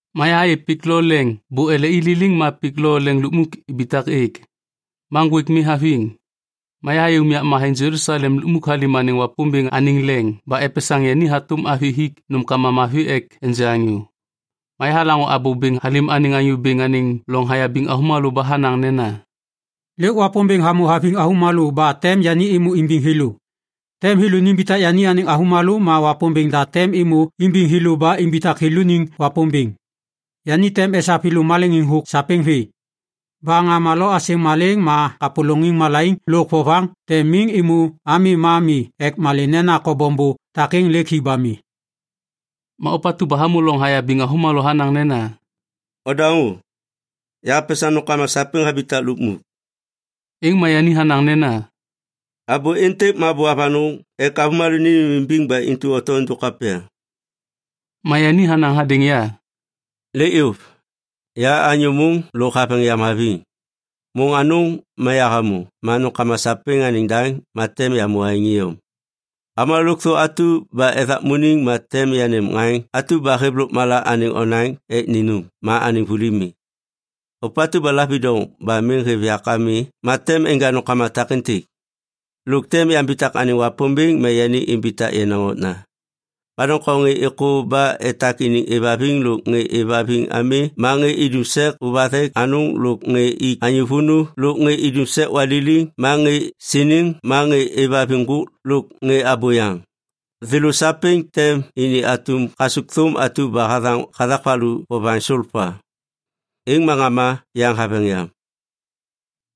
Ma yahayê pik lo leŋ bô ele i liliŋ ma pik lo leŋ lukmuk ibitak êk. Ma ŋgwêk mi haviŋ. Ma yahayê unyak matheŋ Jelusalem lukmuk halêm anêŋ Wapômbêŋ anêŋ leŋ ba epesaŋ yani hatôm avi hik nômkama mavi ek enja anyô. Ma yahalaŋô abô bêŋ halêm anêŋ Anyô Bêŋ anêŋ loŋ hayabiŋ avômalô ba hanaŋ nena, “Lêk Wapômbêŋ hamô haviŋ avômalô ba tem yani êmô imbiŋ thêlô. Tem thêlô nimbitak yani anêŋ avômalô ma Wapômbêŋ da tem êmô imbiŋ thêlô ba imbitak thêlôniŋ Wapômbêŋ. Yani tem esav thêlô maleŋiŋ thôk sapêŋ vê. Ba ŋama lo asêŋ malêŋ ma kapôlôŋiŋ malaiŋ lôk vovaŋ tem miŋ êmô ami ma mi ek malê nena kobom bô takêŋ lêk hi ba mi.” Ma ôpatu ba hamô loŋ hayabiŋ avômalô hanaŋ nena, “Ondaŋô! Yahapesaŋ nômkama sapêŋ habitak lukmuk!” Êŋ ma yani hanaŋ nena, “Abô êntêk ma abô avanôŋ ek avômalô nênêmimbiŋ ba intu oto êndôk kapya.” Ma yani hanaŋ hadêŋ ya, “Lêk yôv! Ya anyô môŋ lôk haveŋ yam haviŋ. Môŋ anôŋ ma yahamô ma nômkama sapêŋ anêŋ daŋ ma tem yamô aêŋ iyom. Avômalô lôkthô atu ba ethakmuniŋ ma tem yanêm ŋaŋ atu ba hêv lôkmala anêŋ onaŋ ek ninum ma anêŋ vuli mi. Ôpatu ba lavidoŋ ba miŋ hêv yak ami ma tem enja nômkama takêntêk. Lôk tem yambitak anêŋ Wapômbêŋ ma yani imbitak yenaŋ okna. Ma doŋtom ŋê êkô ba etak iniŋ êvhaviŋ lôk ŋê êvhaviŋ ami ma ŋê idum sek ôvathek anôŋ lôk ŋê ik anyô vônô lôk ŋê idum sek waliliŋ ma ŋê siniŋ ma ŋê êvhaviŋ ŋgôk lôk ŋê abôyaŋ, thêlô sapêŋ tem ini atum kasukthôm atu ba hathaŋ hathak valu vovaŋ solpa. Êŋ ma ŋama yaŋ haveŋ yam.”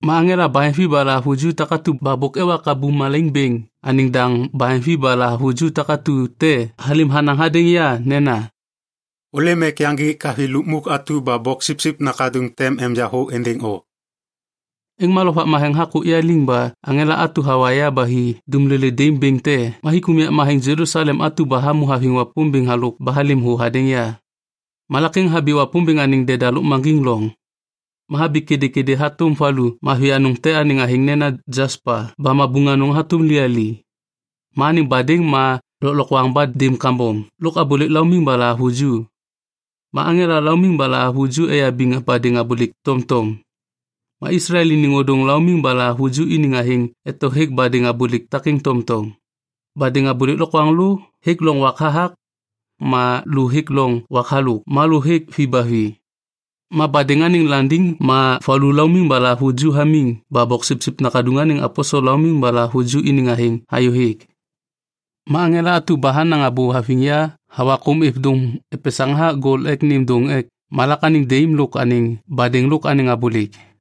Ma aŋela baheŋvi ba lahavuju takatu ba bôk ewa kabum malaiŋ bêŋ anêŋ daŋ baheŋvi ba lahavuju takatu te halêm hanaŋ hadêŋ ya nena, “Ôlêm ek yaŋgik avi lukmuk atu ba Boksipsip Nakaduŋ tem enja thô êndêŋ o.” Êŋ ma Lovak Matheŋ hakôk ya liŋ ba aŋela atu hawa ya ba hi dumlolê daim bêŋ te ma hik unyak matheŋ Jelusalem atu ba hamô haviŋ Wapômbêŋ halôk ba halêm thô hadêŋ ya. Malak êŋ habi Wapômbêŋ anêŋ deda lôkmaŋgiŋ loŋ. Ma habi kêdêkêdê hatôm valu mavi anôŋ te anêŋ athêŋ nena jaspa ba mabuŋ anôŋ hatôm liyali. Ma anêŋ badêŋ ma lôklokwaŋ ba daim kambom lôk abôlêk laumiŋ ba lahavuju. Ma aŋela laumiŋ ba lahavuju eyabiŋ badêŋ abôlêk tomtom. Ma Islael iniŋ ôdôŋ laumiŋ ba lahavuju iniŋ athêŋ eto hêk badêŋ abôlêk takêŋ tomtom. Badêŋ abôlêk lokwaŋlô hêk loŋ wak hathak, ma lô hêk loŋ wak halôk ma lô hêk vi ba vi. Ma badêŋ anêŋ landiŋ ma valu laumiŋ ba lahavuju hamiŋ ba Boksipsip Nakaduŋ anêŋ aposel laumiŋ ba lahavuju iniŋ athêŋ hayôhêk. Ma aŋela atu ba hanaŋ abô haviŋ ya hawa kôm êv dôŋ epesaŋ hathak gol ek nêm dôŋ ek malak anêŋ daim lôk anêŋ badêŋ lôk anêŋ abôlêk.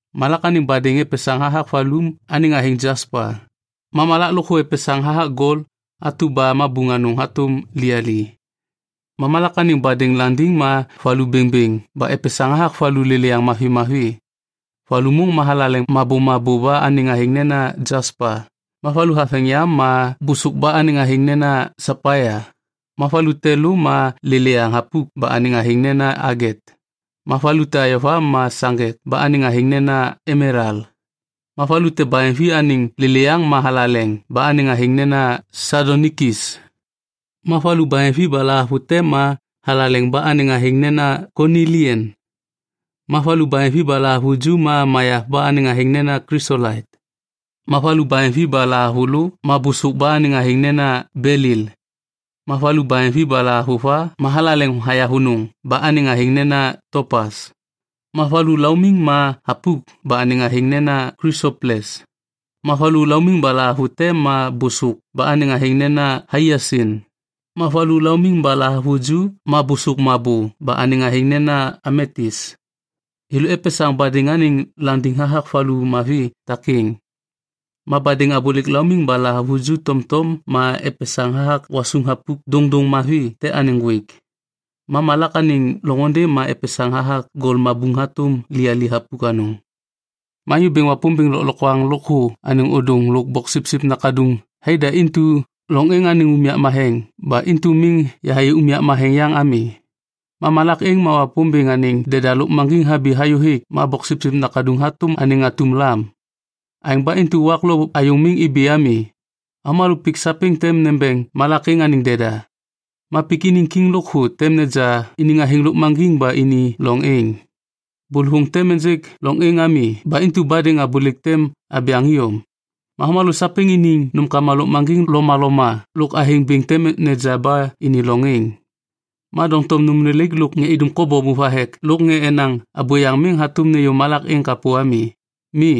Malak anêŋ badêŋ epesaŋ hathak valu anêŋ athêŋ jaspa, ma malak lôkthô epesaŋ hathak gol atu ba mabuŋ anôŋ hatôm liyali. Ma malak anêŋ badêŋ landiŋ ma valu bêŋbêŋ ba epesaŋ hathak valu lêlêyaŋ mavi mavi. Valu môŋ ma thalaleŋ mabômabô ba anêŋ athêŋ nena jaspa, ma valu haveŋ yam ma bôsôk ba anêŋ athêŋ nena sapaia, ma valu te lô ma lêlêyaŋ thapuk ba anêŋ athêŋ nena aget, ma valu te ayova ma saŋgek ba anêŋ athêŋ nena emelal, ma valu te baheŋvi anêŋ lêlêyaŋ ma thalaleŋ ba anêŋ athêŋ nena sadonikis, ma valu baheŋvi ba lahavute ma thalaleŋ ba anêŋ athêŋ nena konilian, ma valu baheŋvi ba lahavuju ma mayav ba anêŋ athêŋ nena klisolait, ma valu baheŋvi ba lahavulô ma bôsôk ba anêŋ athêŋ nena belil, ma valu baheŋvi ba lahavuva ma thalaleŋ hayavônô ba anêŋ athêŋ nena topas, ma valu laumiŋ ma thapuk ba anêŋ athêŋ nena klisoples, ma valu laumiŋ ba lahavute ma bôsôk ba anêŋ athêŋ nena haiasin ma valu laumiŋ ba lahavuju ma bôsôk mabô ba anêŋ athêŋ nena ametis. Thêlô epesaŋ badêŋ anêŋ landiŋ hathak valu mavi takêŋ. Ma badêŋ abôlêk laumiŋ ba lahavuju tomtom ma epesaŋ hathak gwasuŋ thapuk dôŋdôŋ mavi te anêŋ ŋgwêk. Ma malak anêŋ loŋôndê ma epesaŋ hathak gol mabuŋ hatôm liyali thapuk anôŋ. Ma Anyô Bêŋ Wapômbêŋ Lôklokwaŋ Lôkthô anêŋ Ôdôŋ lôk Boksipsip Nakaduŋ thaida intu loŋ êŋ anêŋ unyak matheŋ ba intu miŋ yahayê unyak matheŋ yaŋ ami. Ma malak êŋ ma Wapômbêŋ anêŋ deda lôkmaŋgiŋ habi hayô hêk ma Boksipsip Nakaduŋ hatôm anêŋ atum lam. Aêŋ ba intu wak lo ayôŋ miŋ ibi ami. Avômalô pik sapêŋ tem nembeŋ malak êŋ anêŋ deda. Ma pik iniŋ kiŋ lôkthô tem neja iniŋ athêŋ lôkmaŋgiŋ ba ini loŋ êŋ. Bôlôvôŋ tem ênjêk loŋ êŋ ami ba intu badêŋ abôlêk tem abyaŋ iyom. Ma avômalô sapêŋ iniŋ nômkama lôkmaŋgiŋ lomaloma lôk athêŋ bêŋ tem neja ba ini loŋ êŋ. Ma doŋtom nôm lelaik lôk ŋê idum kobom ôvathek lôk ŋê enaŋ abôyaŋ miŋ hatôm nêyô malak êŋ kapô ami. Mi,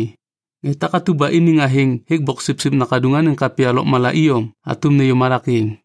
ŋê takatu ba iniŋ athêŋ hêk Boksipsip Nakaduŋ anêŋ kapya lôkmala iyom hatôm nêyô malak êŋ.